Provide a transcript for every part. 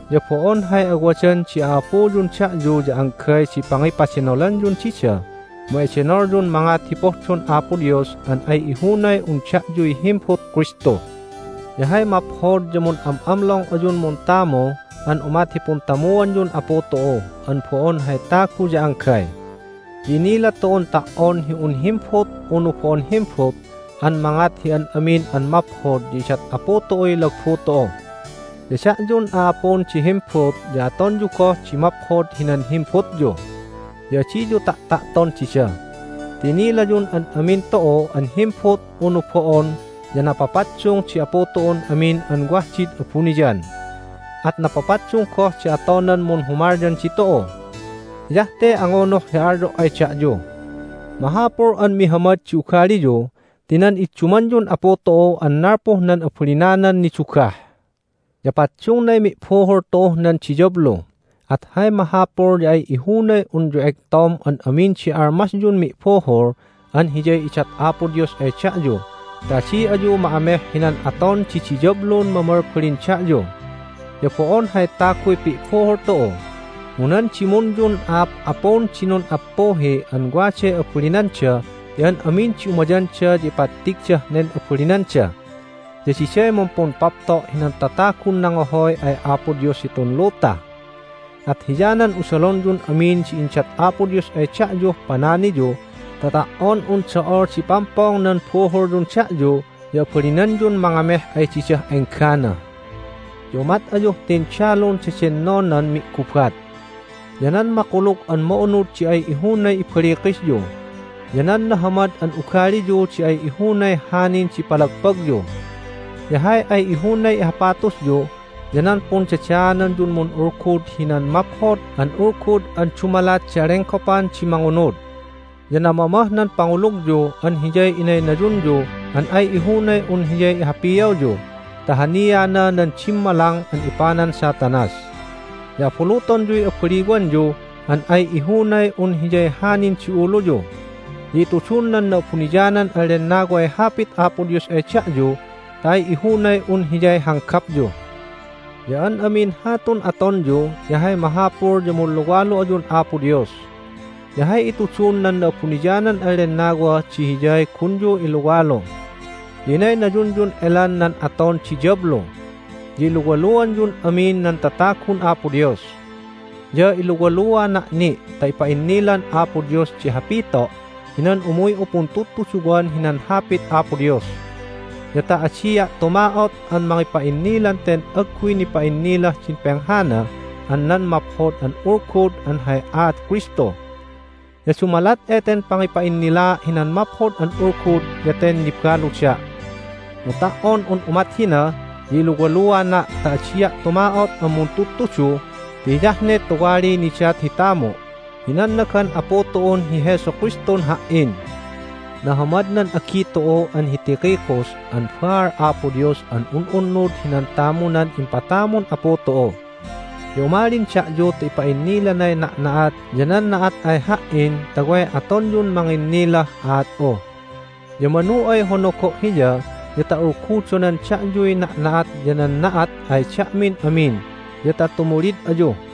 Ya bo'on hay awadan di a'apuyun da'yu ya anggay di pangipadenolanyun dida mu edenolyun mangat hi pohdon Apo Dios an ay ihunay un da'yuy himbut Kristu. Ya hay maphod ya mun'am'amlong ayun muntamu an umat hi puntamuanyun Apu tu'u an bo'on hay tagu ya anggay. Ya innila tu'un ta"on hi un himbut unu bo'on himbut an mangat hi an amin an maphod ya idat Apu tu'uy lagbu tu'u. Ya da'yun a'apun di himbut ya atonyu goh di maphod hinan himbutyu, ya adiyu ta'ta'ton dida. Ti inilayun an amin tu'u an himbut unu bo'on ya napapaddung di Apu tu'un amin an wah did abuniyan, at napapaddung goh di atonan munhumalyan ditu'u. Hiyah te angunuh hi alyo' ay da'yu: Mahapul an mihamad di ugaliyu ti nan iddumanyun Apu tu'u an nalpuh nan abalinanan nidugah. Ya paddungnay mi'buhul tu'uh nan diyablu, at hay mahapul ya ay ihunay unyu egtom an amin di armasyun mi'buhul an hiyay idat Apo Dios ay da'yu ta adi ayu ma'ameh hinan aton di diyablun mamalbalin da'yu. Ya bo'on hay taguy pi'buhul tu'u, mu nan dimunyun a'ap'apun di nun'appuhi an waday abalinanda ti an amin di umayanda ya ipattigdah nen abalinanda. Ya diday mumpumpapto' hinan tatagun nangohoy ay Apo Dios hitun luta. At hiyanan usalonyun amin di indat Apo Dios ay da'yuh pananiyu ta ta"on un do'ol di pampong nan buhulyun da'yu ya abalinanyun mangameh ay didah enggana. Ya umat ayuh tindalun dedennonan mi'gubat. Ya nan Makulug an Ma'unud di ay ihunay ibalikisyu, ya nan nahamad an ugaliyu di ay ihunay hanin di palagpagyu. Ya hay ay ihunay ihapatusyu ya nan pundadaananyun mun'ulgud hinan Maphod an Ulgud an dumalat di alenggopan di mangunud. Ya namamah nan pangulugyu an hiyay inaynayunyu an ay ihunay un hiyay ihapiawyu ta haniana nan dimmalang an ipanan Satanas. Ya abulutonyuy abaliwanyu an ay ihunay un hiyay hanin di uluyu. Ya itudun nan Na'abuniyanan an Lennaway Hapit Apo Dios ay da'yu ta ay ihunay un hiyay hanggapyu. Ya an amin hatun atonyu ya hay mahapul ya munluwalu ayun Apo Dios. Ya hay itudun nan Na'abuniyanan an Lennawa di hiyay gunyu iluwalu. Ya inaynayunyun elan nan aton di diyablu, ya iluwaluanyun amin nan tatagun Apo Dios. Ya iluwaluana' ni' ta ipa'innilan Apo Dios di hapito' hinan umuy'u puntudtuduwan hinan Hapit Apo Dios, ya ta adia' tuma'ot an mangipa'innilan ten agguy nipa'innilah din penghana an nan Maphod an Ulgud an hay aat Kristu. Ya dumalat eten pangipa'innilaa' hinan Maphod an Ulgud ya ten nibaluda', mu ta"on un umat hina ya iluwaluana' ta adia' tuma'ot an muntudtudu ti hiyah ne tuwaliy nidat hi tamu' hi nannagan Apu tu'un hi Jesu Kristun ha"in. Nahamad nan agi tu'u an hi Tychicus an baal Apo Dios an un'unnud hinan tamunan impatamun Apu tu'u. Ya umalin da'yu ta ipa'innilanay na'na'at ya nan na'at ay ha"in ta way atonyun manginnilah aat'u. Ya manu ay honogo' hiya ya ta ulgudonan da'yuy na'na'at ya nan na'at ay da'min amin ya ta tumulid ayu.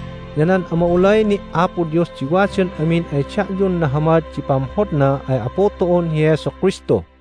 Ya nan ama'ulay ni' Apo Dios di wadan amin ay da'yun nahamad di pamhodna ay Apu tu'un hi Jesu Kristu.